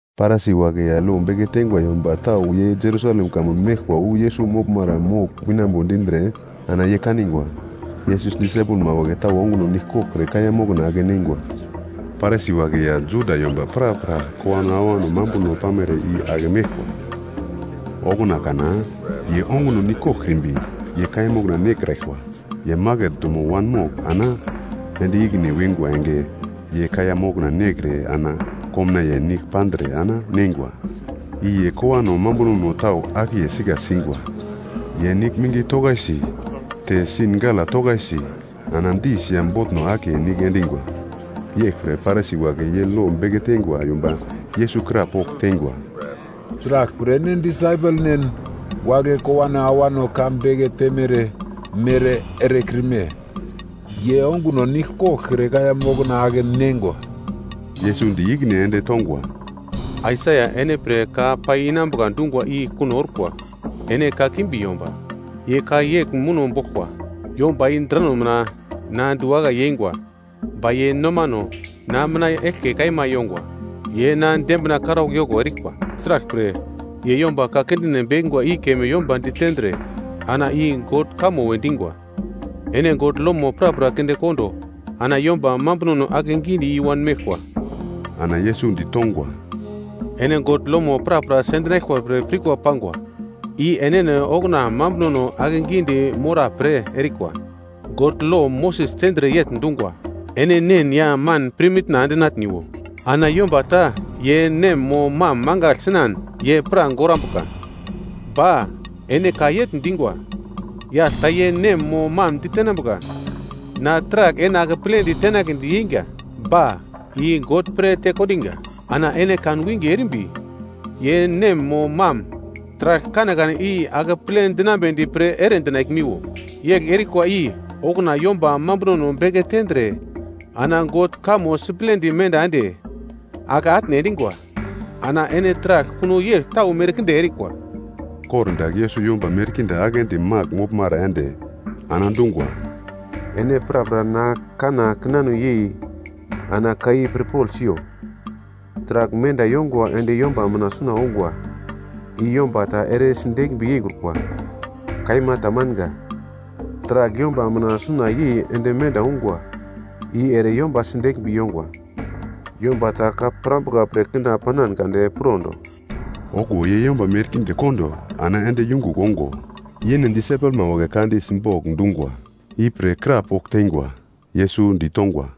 Parisi wagle ya lo beke teingwa yomba tau ye Jerusalem kamun meglkwa wu Yesus moglmara mogl winambo dindre, ana ye kanigwa, Yesus disaipelma wagle tau onguno nigl koglkre kaiya mokna ake neingwa. Parisi wagle ya Juda yomba prapra kowano awano mambuno pamere i ake meglkwa. Okuna kana ye onguno nigl koglkrimbi ye kaiya mokna nekraglkwa. Ye maket dumo wanmogl ana ende ikine wingwa enge, ye kaiya mokna nekre ana komnaiye nigl pandre ana neingwa. I ye kowano mambunono tau akiye sika singwa. Ye nigl mingi tokaisi te sin gala tokaisi ana dis ya botno akiye nigl endingwa. Yeglpre Parisi wagle ya lo beke teingwa yomba Yesus krapogl teingwa, “Sraglpre ene disaipelnen wagle kowano awano ka beke temere mere erekrime? Ye onguno nigl koglkre kaiya mokna ake neingwa.” Yesus di ikine ende tongwa, “Aisaia ene pre ka pai inambuka dungwa i kuno orkwa! Ene kakimbi yomba, ye ka yegl muno boglkwa. “‘Yomba i drano mina na diwakai yeingwa. Ba ye nomano na mina eglke kaima yongwa. Ye na dembina karaugl yoko erikwa. Sraglpre, ye yomba ka kindine bekingwa i keme yomba ditendre ana i God kamo we dingwa.’ Ene God lomo prapra kinde kondo ana yomba mambunono akegidi i-wan meglkwa.” Ana Yesus ditongwa, “Ene God lomo prapra sendinaglkwa pre pirkwa pangwa. I enene okuna mambunono akegidi mora pre erikwa. God lo Moses tendre yegl dungwa, ‘Ene nen ya man pirmitna endinatniwo.’ Ana, ‘Yomba ta ye nem mo mam mangagl sinan, ye pra gorambuka.’ Ba ene ka yegl dingwa, ‘Yagl ta ye nem mo mam ditenambuka, na taragl ene akepledi tenagledi yeinga. Ba, i God pre tekondinga.’ Ana ene kan winge erimbi ye nem mo mam taragl kanekane i akeple dinambedi pre ere dinaglmiwo. Yegl erikwa i okuna yomba mambunono beke tendre ana God kamo siplendi menda ende, ake atne endingwa. Ana ene taragl kuno yegl tau merkinde erikwa.” Kordagl Yesus yomba merkinde aglendi magl moglmara ende, ana dungwa, “Ene prapra na kanna kinano yei ana ka i pirpogl siyo. Taragl menda yongwa ende yomba mina suna ongwa i yomba ta ere sideglmbi yeikrukwa. Kaima tamanga. Taragl yomba mina suna yei ende menda ungwa i ere yomba sideglmbi yongwa. Yomba ta ka pirambuka pre kina panan kade pirondo.” Okuwo ye yomba merkinde kondo ana ende yungugl ongo, yene disaipelma wagle ka di simbogl dungwa ipre krapogl teingwa. Yesus ditongwa,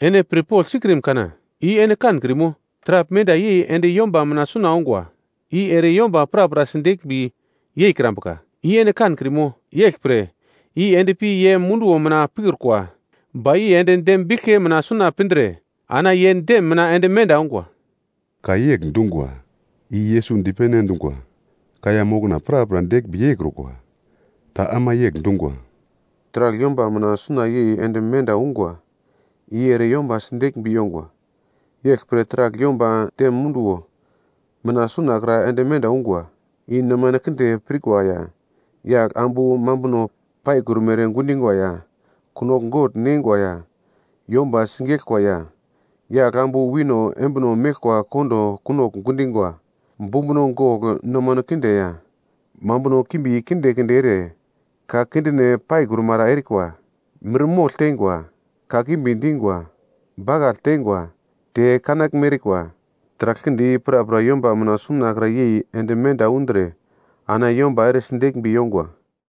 “Ene pirpogl sikrim kana, i ene kankrimo? Taragl menda yei ende yomba mina suna ongwa, i ere yomba pra sideglmbi yeikrambuka. I ene kankrimo? Yeglpre, i endpi ye munduwo mina pikrukwa. Ba i ende dem biglke mina suna pindre ana ye dem mina ende menda ongwa.” (Ka yegl dungwa i Yesus dipene endungwa, ‘Kaiya mokna prapra deglmbi yeikrukwa.’) Ta ama yegl dungwa, “Taragl yomba mina suna yei ende menda ungwa i ere yomba sideglmbi yongwa. Yeglpre taragl yomba dem munduwo mina sunakra ende menda ungwa, i nomano kinde pirkwa ya, yagl ambu mambuno paikrumere gundingwa ya, kunogl gogl neingwa ya, yomba sigeglkwa ya, yagl ambu wino embino meglkwa kondo kunogl gundingwa, bumbuno gogl, nomano kinde ya, mambuno kimbi kinde kinde ere, ka kindine paikrumara erikwa, mirmogl teingwa, kakimbi dingwa, bakagl teingwa, te kenaglme erikwa. Taragl kinde i prapra yomba mina sunakra yei ende menda undre ana yomba ere sideglmbi yongwa.”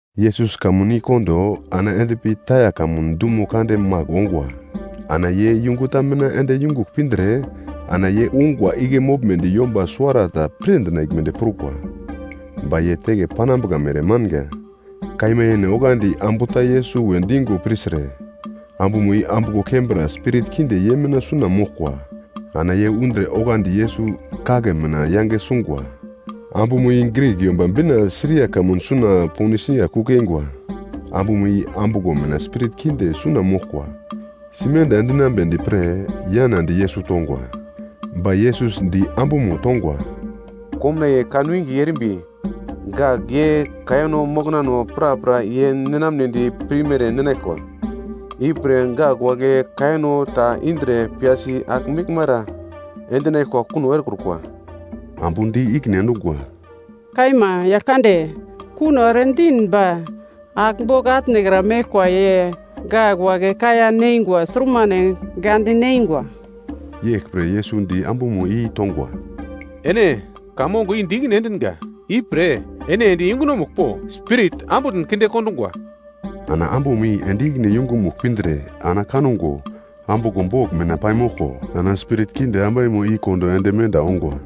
Yesus kamun i kondo ana endpi Taia kamun dumo kande magl ongwa. Ana ye yungu ta mina ende yungugl pindre ana ye ungwa igle moglmedi yomba suwarata pir dinaglmedi prukwa. Ba ye teke panambuka mere manga. Kaima yene, onglandi ambu ta Yesus we dingo pirtre, ambumo i ambuglo kembra spirit kinde ye mina suna moglkwa. Ana ye undre oglandi Yesus kagle mina yange sungwa. Ambumo i Grik, Yomba Bina, Siria kamun suna Ponisia kugl yeingwa. Ambumo i ambuglo mina spirit kinde suna moglkwa, simenda endinambedi pre yanadi Yesus tongwa. Ba Yesus di ambumo tongwa, “Komnaiye kanwinge erimbi gak ye kaiyano moknano prapra ye ninamnedi pirmere ninaglkwa, ipre gak wagle kaiyano ta indre piyasi agl meglmara endinaglkwa kuno erekrukwa.” Ambu di ikine endungwa, “Kaima, Yaglkande, kuno ere din ba, agl bogl atnekra meglkwa ye gak wagle kaiya neingwa surmane gande neingwa.” Yeglpre Yesus di ambumo i tongwa, “Ene ka mongo di ikine endinga, ipre ene ende yungunomugl po, spirit ambutn kinde kondungwa.” Ana ambumo i ende ikine yungumugl pindre ana kango, ambuglo bogl mina paimoglko ana spirit kinde ambaimo i kondo ende menda ongwa.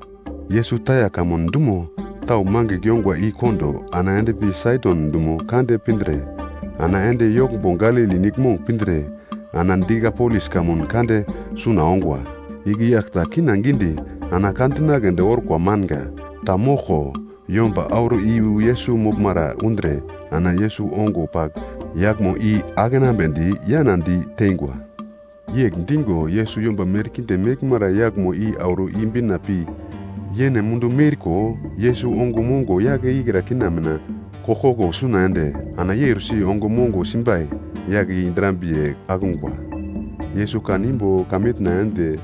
Yesus Taia kamun dumo tau mangigl yongwa i kondo ana endpi Saidon dumo kande pindre, ana ende yoglmbo Galili Niglmong pindre, ana Dikapolis kamun kande suna ongwa. Igle yagl ta kina gidi ana ka dinagledi orko manga ta moglko yomba auro iyu Yesus moglmara undre, ana Yesus ongo pagl yaglmo i akenambedi yana di teingwa. Yegl dingo Yesus yomba merkinde meglmara yaglmo i auro i-bina pi yene mundu miurko, Yesus ongo mongo yagle i kina mina koglkoglo suna ende ana eursi ongo mongo simbai yagle i drambiye akungwa. Yesus kan imbo heven ende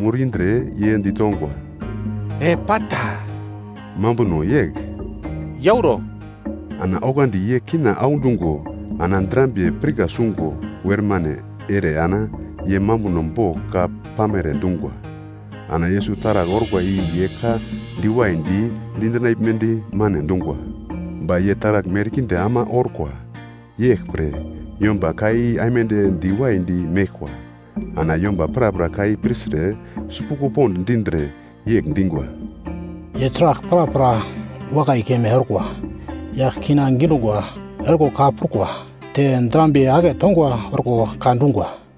mur indre ye ditongwa, “Epata!” (mambuno yegl “Yauro!”), ana oglandi ye kina audungo ana drambiye pirka sungo wermane ere ana ye mambuno bogl ka pamere dungwa. Ana Yesus taragl orkwa i ye ka diwaidi dinaglmedi mane dungwa, ba ye taragl merkinde ama orkwa. Yeglpre yomba ka i aimande diwaidi meglkwa. Ana yomba prapra ka i pirtre sipuglo pond dindre, yegl dingwa, “Ye taragl prapra wakai keme orkwa. Yagl kina gidungwa orko ka prukwa, te drambiye aketongwa orko ka dungwa.”